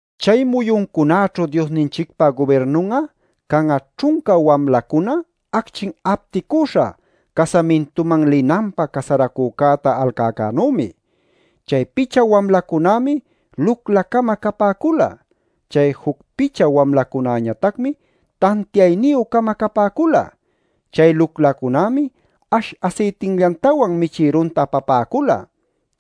“Chay muyuncunaćhu Diosninchicpa gubirnun'a can'a ćhunca wamlacuna acchin apticüśha casamintuman linanpä casaracücäta alcäcänümi. Chay picha wamlacunämi lucla-cama capäcula; chay juc picha wamlacunäñatacmi tantiayniyü-cama capäcula. Chay luclacunämi ash asaytillantawan michïrunta apapäcula.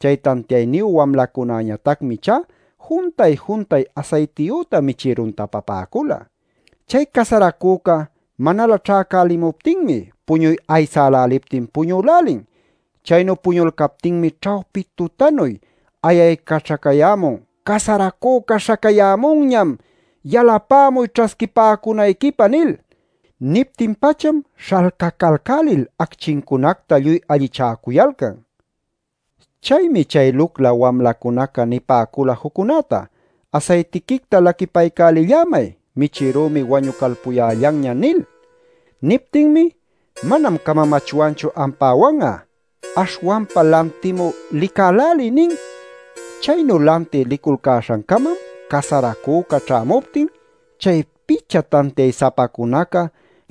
Chay tantiayniyu wamlacunäñatacmi ichá juntay-juntay asaytiyüta michïrunta apapäcula. Chay casaracüca manalä ćhäcälimuptinmi puñuy aysäläliptin puñülälin. Chaynu puñulcaptinmi ćhawpi tutanuy ayaycaćhacayämun ‘¡Casaracüca śhacayämunñam! ¡Yalapämuy ćhasquipäcunayquipä!’ nil. Niptin-pacham śhalcacalcälil acchincunacta lluy allichäcuyalcan. Chaymi chay lucla wamlacunaca nipäcula juccunäta: ‘Asaytiquicta laquipaycälillämay; michïrümi wañucalpuyällanña’ nil. Niptinmi: ‘Manam camamachwanchu ampäwan'a. Aśhwanpa lantimü licäläliy’ nin. Chaynu lantï liculcäśhancamam casaracüca ćhämuptin chay picha tantiay-sapacunaca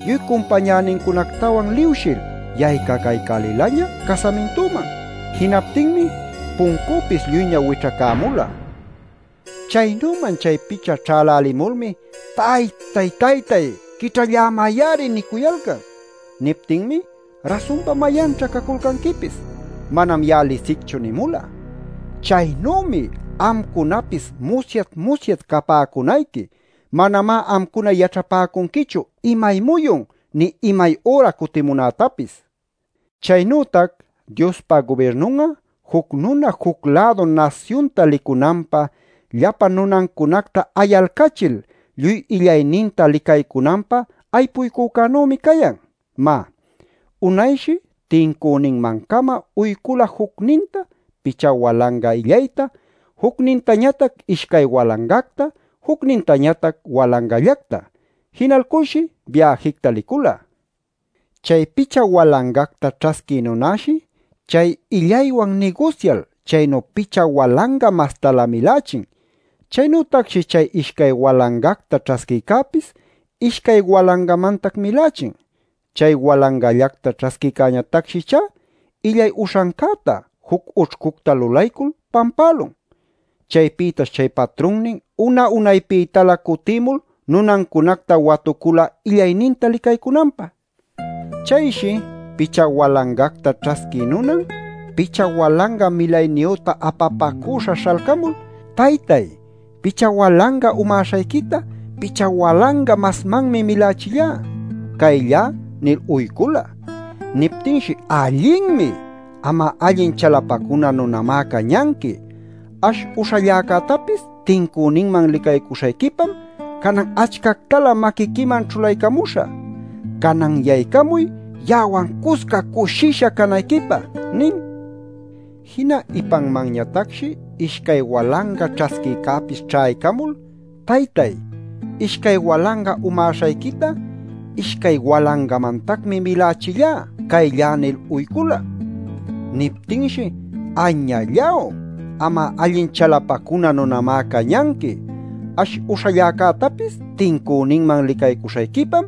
lluy cumpañänincunactawan liwshil yaycacaycälilaña casamintüman. Jinaptinmi puncüpis lluyña wićhacämula. Chaynüman chay picha ćhälälimulmi ‘¡Taytay Taytay, quićhallämay-ari!’ nicuyalcan. Niptinmi ‘Rasunpa ¿mayanćha caculcanquipis? Manam ya'a lisicchu’ nimula. Chaynümi amcunapis musyat-musyat capäcunayqui. Manamá amcuna yaćhapäcunquichu imay muyun, nï imay üra cutimunätapis. “Chaynütac Diospa gubirnun'a juc nuna juc-lädu nasyunta licunanpä llapa nunancunacta ayalcachil lluy illayninta licaycunanpä aypuycücänümi cayan. Má, unayshi tincüninman-cama uycula jucninta picha walanga illayta, jucnintañatac ishcay walangacta, jucnintañatac walangallacta. Jinalculshi biäjicta licula. Chay picha walangacta ćhasquï nunäshi chay illaywan nigusyal, chaynu picha walanga mastalä milächin. Chaynütacshi chay ishcay walangacta ćhasquïcäpis, ishcay walangamantac milächin. Chay walangallacta ćhasquïcäñatacshi ichá illay uśhancäta juc ućhcucta lulaycul pampälun. “Chaypïtash chay patrunnin una-unaypïtalä cutïmul nunancunacta watucula illayninta licaycunanpä. Chayshi picha walangacta ćhasquï nunan picha walanga milayniyüta apapacüśha śhalcamul: ‘Taytay, picha walanga umäśhayquita picha walanga masmanmi milachillá. Cayllá’ nil uycula. “Niptinshi: ‘¡Allinmi! Am'a allin chalapacuna nunamá cañanqui. Ash uśhäcällactapis tincüninman licaycuśhayquipam canan achcactalä maquiquiman ćhulaycamuśhä. ¡Canan yaycamuy ya'awan cusca cushisha canayquipä!’ nin. “Jina ipanmanñatacshi ishcay walanga ćhasquïcäpis ćhaycamul: ‘Taytay, ishcay walanga umäśhayquita ishcay walangamantacmi milachillá. Cayllá’ nil uycula. “Niptinshi: ‘¡Añalláw! Am'a allin chalapacuna nunamá cañanqui. Ash uśhalläcätapis tincüninman licaycuśhayquipam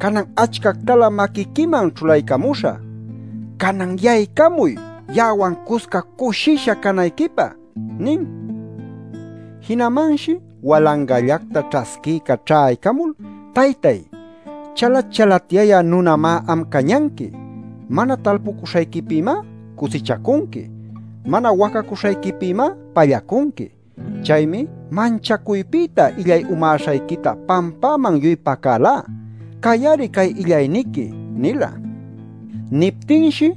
canan achcactalä maquiquiman ćhulaycamuśhä. ¡Canan yaycamuy ya'awan cusca cushisha canayquipä!’ nin. “Jinamanshi walangallacta ćhasquïca ćhaycamul: ‘Taytay, chalat-chalatyayä nunamá am cañanqui. Mana talpucuśhayquipïmá cusichacunqui. Mana wacacuśhayquipïmá pallacunqui. Chaymi manchacuypïta illay umäśhayquita pampäman lluy pacälá. Cay-ari cay illayniqui’ nila. “Niptinshi: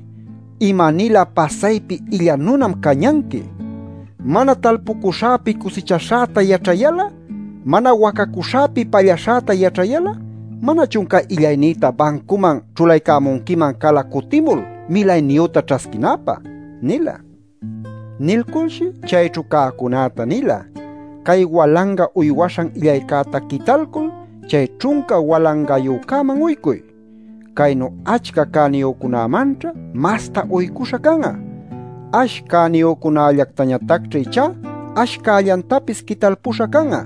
‘¡Ima-nilä pasaypi illa nunam cañanqui! Mana talpuśhäpi cusichaśhäta yaćhayal'a, mana wacacuśhäpi pallaśhäta yaćhayal'a ¿manachun cay illaynïta bancuman ćhulaycämunquiman cala cutimul milayniyüta ćhasquinäpä?’ nila. Nilculshi chayćhu cäcunäta nila: ‘Cay walanga uywaśhan illaycäta quitalcul, chay ćhunca walangayücäman uycuy. Caynu achca cäniyücunämanćha masta uycuśha can'a. Ash cäniyücunallactañatacćha ichá ash cällantapis quitalpuśha can'a.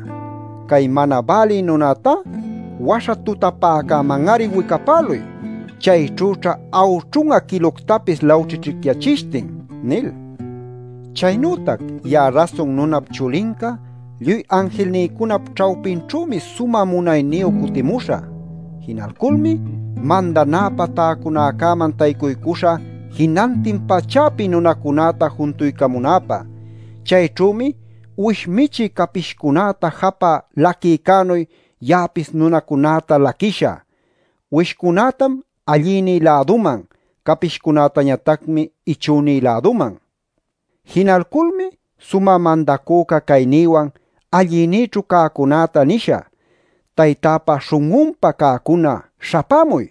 Cay mana bälï nunätá waśha tutapäcäman-ari wicapäluy. Chayćhüćha awćhun'a quiluctapis lawćhićhicyachishtin’ nil. “Chaynütac ya'a Rasun Nunap Chulinca lluy anjilnïcunap ćhawpinćhümi sumä munayniyu cutimuśhä. Jinalculmi mandanäpä täcunäcäman taycuycuśhä jinantin pachäpi nunacunäta juntuycamunäpä. Chayćhümi uwish michï capishcunäta japä laquïcänuy, ya'apis nunacunäta laquishä. Uwishcunätam allïnï-läduman; capishcunätañatacmi ichünï-läduman. Jinalculmi sumä mandacüca caynïwan allïnïćhu cäcunäta nishä: ‘Taytäpa śhun'unpa cäcuna, śhapämuy.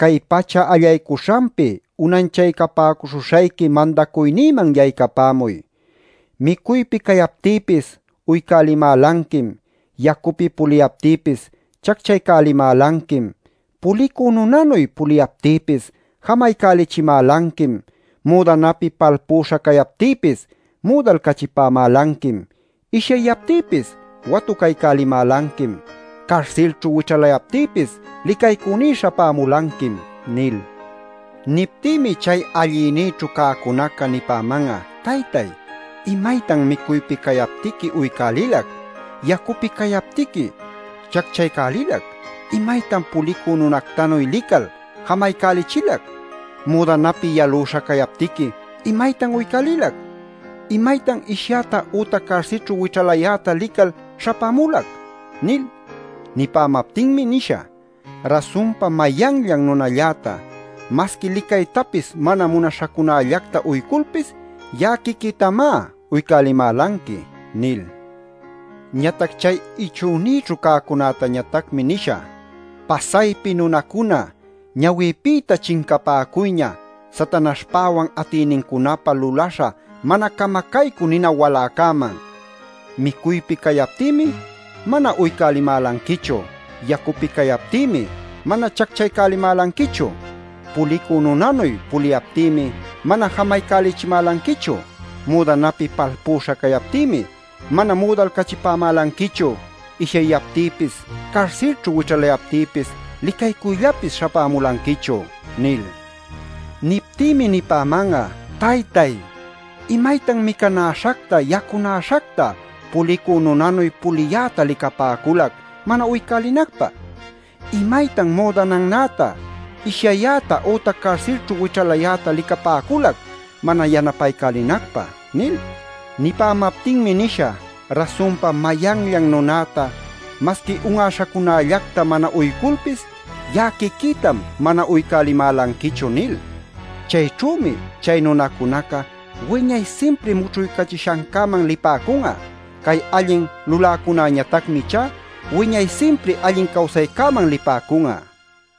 Cay pacha allaycuśhanpi unanchaycapäcuśhuśhayqui mandacuynïman yaycapämuy. Micuypi cayaptïpis uycälimälanquim. Yacupi puliyaptïpis chacchaycälimälanquim. Pulicü nunanuy puliyaptïpis jamaycälichimälanquim. Müdanapi palpüśha cayaptïpis müdalcachipämälanquim. Ishyayaptïpis watucaycälimälanquim. Carsilćhu wićhalayaptïpis licaycüní śhapämulanquim’ nil. “Niptïmi chay allïnïćhu cäcunaca nipäman'a: ‘Taytay, ¿imaytan micuypi cayaptiqui uycälilac, yacupi cayaptiqui chacchaycälilac? ¿Imaytan pulicü nunactanuy lical, jamaycälichilac? Müdanapi yalüśha cayaptiqui ¿imaytan uycälilac? ¿Imaytan ishyäta ütac carsilćhu wićhalayäta lical śhapämulac?’ nil. “Nipämaptinmi nishä: ‘Rasunpa mayanllan nunalläta masqui licaytapis mana munaśhacunällacta uyculpis, ya'a quiquïtamá uycälimälanqui’ nil. “Ñatac chay ichünïćhu cäcunätañatacmi nishä: ‘¡Pasaypi nunacuna, ñawïpïta chincapäcuyña Satanaśhpäwan atïnincunapä lulaśha mana camacaycü nina waläcäman! Micuypi cayaptïmi mana uycälimälanquichu. Yacupi cayaptïmi mana chacchaycälimälanquichu. Pulicü nunanuy puliyaptïmi mana jamaycälichimälanquichu. Müdanapi palpüśha cayaptïmi, mana müdalcachipämälanquichu. Ishyayaptïpis, carsilćhu wićhalayaptïpis licaycüllapis śhapämulanquichu’ nil. Niptïmi nipäman'a: ‘Taytay, ¿imaytan micanäśhacta, yacunäśhacta, pulicü nunanuy puliyäta licapäculac mana uycälinacpä? ¿Imaytan müdanannäta, ishyayäta ütac carsilćhu wićhalayäta licapäculac mana yanapaycälinacpä?’ nil. Nipämaptinmi nisha: ‘Rasunpa mayanllan nunäta masqui un'aśhacunallacta mana uyculpis, ya'a quiquïtam mana uycälimälanquichu’ nil. Chayćhümi chay nunacunaca wiñay simpri mućhuycachishancäman lipäcun'a. Cay allin luläcunañatacmi ichá wiñay simpri allin cawsaycäman lipäcun'a” nin.